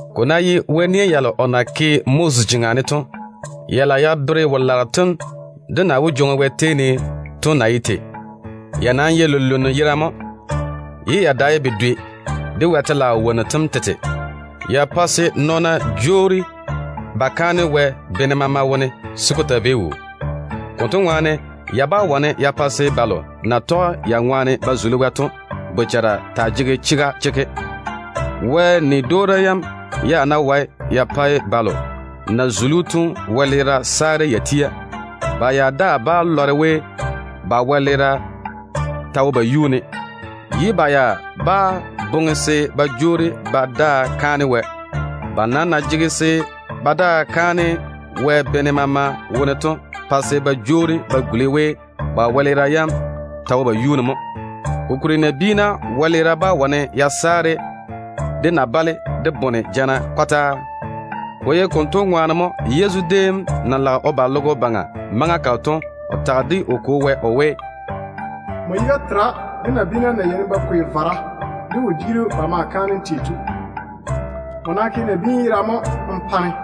Ko ná ye Wɛ nia yalo o na ke Moses jeŋa ne to, ya lage ya bere wo-laaro tem de na wó jwoŋi Wɛ tei ne to na ye tei to mo. Ya nam ye lunluŋu yerane mo, ye ya dae bedwe de Wɛ telaao wonnu tem tete. Ya pae se nɔɔna jwoori ba kaane Wɛ bene maama wone se ko taa vei wuu. Konto ŋwaane, ya bá wane ya pa se balo na tɔge ya ŋwaane ba zuli Wɛ to bochara taa jege chega chekke. Wɛ nia yam ya ná wae ya pae balo na zuli‑o to wɛleera saare ya tia, ba ya daa bá lɔre we ba wɛleera ta wo ba yuu ne, ye ba ya bá boŋe se ba jwoori ba daa kaane Wɛ konto dwoŋi. Ba nam na jege se ba daa kaane Wɛ bene maama wone to pae se ba jwoori ba guli we ba wɛleera yam ta wo ba yuu ne mo. Kokuri nabiina wɛleera bá wane ya saare de na-bale de bone jana kɔtaa. Ko ye konto ŋwaane mo Yezu déem na lage o ba logo baŋa maŋa kalo to, o tage de o Kwo Wɛ o we: “Nmo yiga tera de nabiina na yeini ba kwei vara de wodiiru ba ma ke kaanem ba pa‑m tei to. Nmo nam ke nabiinu yera mo n pa-ne.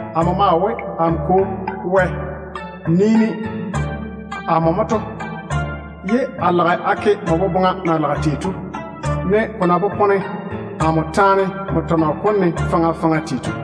Amo maa we, ‘Amo Kwo Wɛ, nii-ne da! Amo tu se a toŋe nmo boboŋa na lage tei to, ne ko na maŋe ko popone amo taane nmo faŋa faŋa tɔnɔ kom ne tei to.’”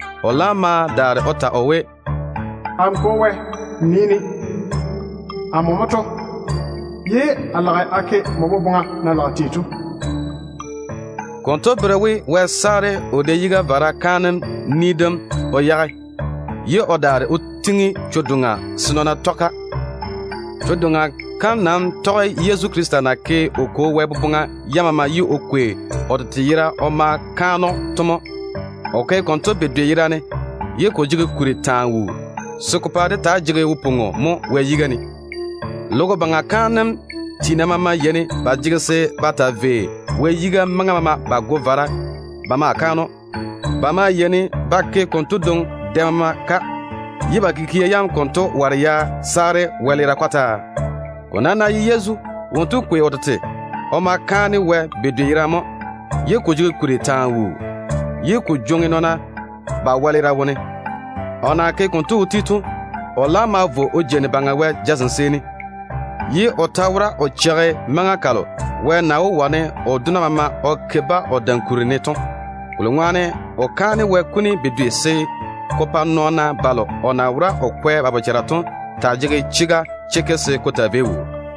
O laam ma daare o ta o we, “Amo Kwo Wɛ, nii-ne da! Amo tu se a ke nmo boboŋa na lage tei to.” Konto bere we Wɛ saare o da-yiga vara kaanem ni dem o yage, ye o daare o tiŋi chwo-doŋa se nɔɔna tɔge-ka. Chwo-doŋa kam nam tɔge Yezu Krista na ke o Kwo Wɛ boboŋa yam maama ye o kwei o tete yera o ma kaane‑o to mo. O ke konto bedwe yerane, ye ko jege kuri taa wuu, se ko pa dé taa ye wose mo Wɛ yiga ne. Logo baŋa kaanem tiina maama yeini ba jege se ba taa vei Wɛ yiga maŋa maama ba goe vara ba maa kaane‑o. Ba maa yeini ba ke konto dwoŋi dɛ maama ka, ye ba kikia yam konto ware ya saare wɛleera kɔtaa. Ko nam ná ye Yezu, wonto kwei o tete o ma kaane Wɛ bedwe yerane mo, ye ko jege kuri taa wuu se ko jwoŋi nɔɔna ba wɛleera wone. O na ke konto o ti to, o laam ma vo o jeini Baŋa Wɛ jazem seeni, ye o ta wora o cheigi maŋa kalo Wɛ na wó wane o dona maama o ke o dam kuri ne to. Kolo ŋwaane o kaane Wɛ kuni bedwe se ko pa nɔɔna balo o na wora o kwɛ ba bochara to taa ye wose se ko taa vei wuu.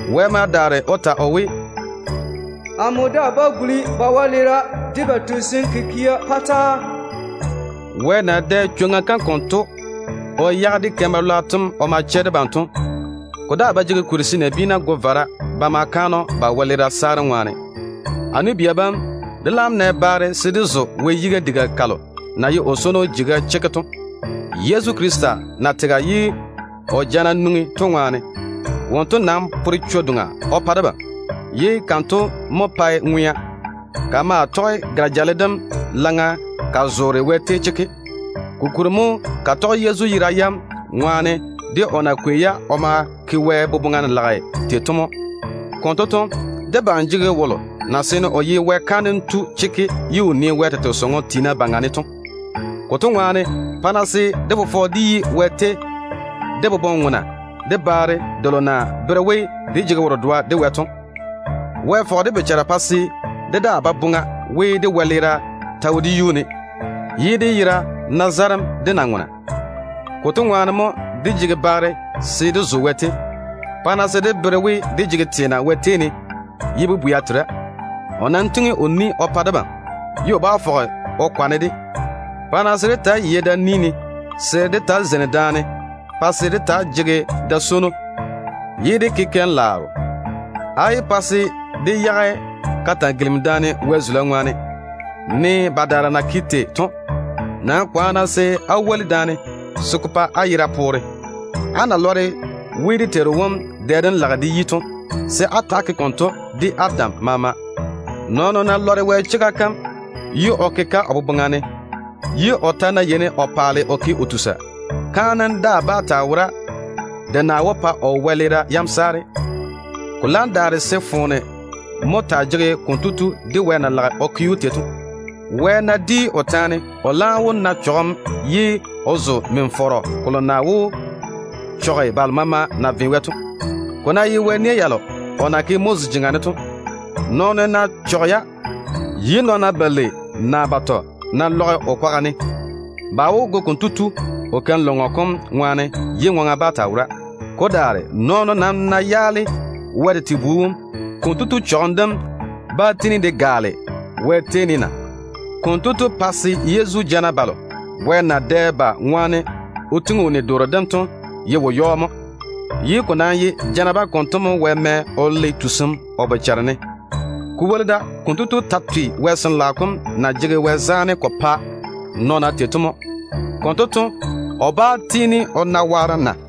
Wɛ ma daare o ta o we, “Amo daa bá guli ba wɛleera de ba tusim kikia yam gula kɔtaa.” Wɛ na dɛ chwoŋa kam konto o yage dé keim-balwaaro tem o ma chɛ debam to, ko daa ba jege kuri se nabiina go vara ba ma kaane‑o ba wɛleera saarem ŋwaane. A nu-bia bam, dé laam nɛ baare se dé zo Wɛ di-yun-gala kam na ye o swono jeiga to, Yezu Krista toone jana bam ŋwaane. Wonto nam pore chwo-doŋa o pa debam, ye kanto mo pae ŋwea. Ka maa tɔge gare-jale dem laŋa ka zoore Wɛ tei chekke. Kokuri mo ka tɔge Yezu yera yam ŋwaane, de o na kwei-ya o ma kaane Wɛ tei to mo. Konto to, debam jege wolo na seene o ye Wɛ kaanem tu chekke ye o nii Wɛ tete sɔŋɔ tiina baŋa ne to. Konto ŋwaane, pa-na se dé fofɔ de yi Wɛ tei de boboŋ-ŋona, de baare delo na bere we dé jege wo-dedoa de Wɛ to. Wɛ fɔge dé bochara pa se dé daa ba boŋa we, dé wɛleera ta wo dé yuu ne, ye dé yera na zarem de na-ŋona. Konto ŋwaane mo dé jege baare se dé zo Wɛ tei. Pa-na se dé bere we, dé jege teena Wɛ tei ne ye bobwea tera. O nam tiŋi o ni o pa debam, ye o bá fɔge o kwane-de. Pa-na se dé taa yei da-ni ne, se dé taa zeini daane, ye dé jege da-swono, ye dé ke keim-laaro. Á yé pa se dé yage ka-taa-gilimi-daane Wɛ zula ŋwaane, ne badaara na ke tei to. Nam kwaane-na se á woli daane se ko pa á yera poore. Á na lɔre we dé Teiru wom dɛ dem lage de yi to, se á tiini á ta‑á ke konto. Nɔɔno ná lɔre Wɛ chega kam ye o ke-ka o boboŋa ne, ye o ta ná yeini o paale o ke o tusa, kaanem daa bá taa wora de na wó pa kotu wɛleera yam saare. Ko laam daare se foone mo taa jege‑o de Wɛ na lage o ke‑o tei to. Wɛ ná di o taane, o laam wó na chɔgem ye o zo min-fɔrɔ kolo na wó chɔge balo maama na done Wɛ to. Ko ná ye Wɛ nia yalo o na ke Moses jeŋa ne to, nɔɔno wolo ná yaale-ya, ye nɔɔna balei naa batɔ ná lɔge o kwaga ne, ba wó go konto tu ye ŋwaŋa bá taa wora. Ko daare nɔɔno ná yaale Wɛ tete Bu wom, konto tu chɔgem dem bá tiini de gaale na? Konto tu pae se Yezu jana balo Wɛ na dɛ ba ŋwaane o gwoni o ni dem to ye wo-yɔɔ mo. Ko nam ye jana bam konto mo Wɛ mɛ o le tusim kotu bochare ne. Ko woli da, konto tu ta twe Wɛ Sin-laao kom na jege Wɛ zaane ko pae nɔɔna tei to mo. Konto to, o bá tiini o na waarem na?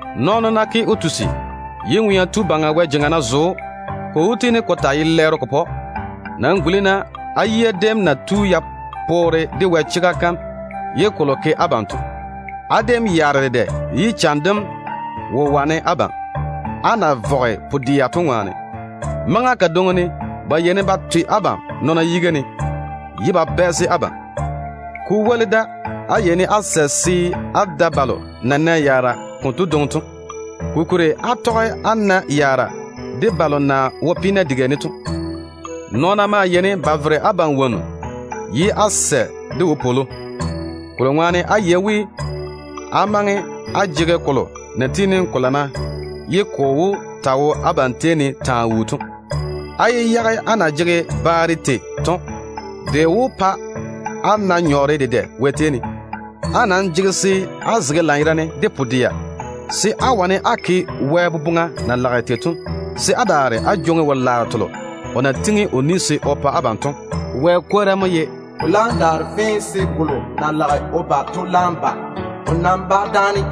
Nɔɔno ná ke o tusi, ye Ŋwea Tu Baŋa Wɛ jeŋa ná zo‑o, ko wó tiini ko taa ye lɛɛro ko pa‑o. Nam guli-na á yia déem na tu ya poore de Wɛ chega kam ye kolo ke abam to. Á déem yaare dedɛ, ye cham dem wo wane abam, á na vɔge pu-dɛa to ŋwaane. Maŋa kadwoŋi ne ba yeini ba twe abam nɔɔna yiga ne, ye ba bɛɛse abam. Maŋa kadwoŋi ne de, á yeini á sɛ se á tɔge á woli balo de na nɛ yaara konto dwoŋi to. Kokuri á tɔge á na yaara de balo na wo peena diga ne to. Nɔɔna maa yeini ba vere abam wonnu ye á sɛ de wopwolo, kolo ŋwaane á yei we, á maŋe á jege kolo na tiini ko lana ye ko wó taa ye abam nyem taa wuu to. Á nam yé yage á na jege baare tei to. Kokuri de lage de pa á na nyɔɔre dedɛ Wɛ tei ne. Á jege se á zege lanyerane de pu-dɛa, se á wane á ke Wɛ boboŋa na lage tei to, se á daare á jwoŋi wo-laaro telo o na pwooli se o pa abam to. Wɛ kwora mo ye: “Ko laam daare fee se wolo na lage o ba to laam ba. O nam bá dáane.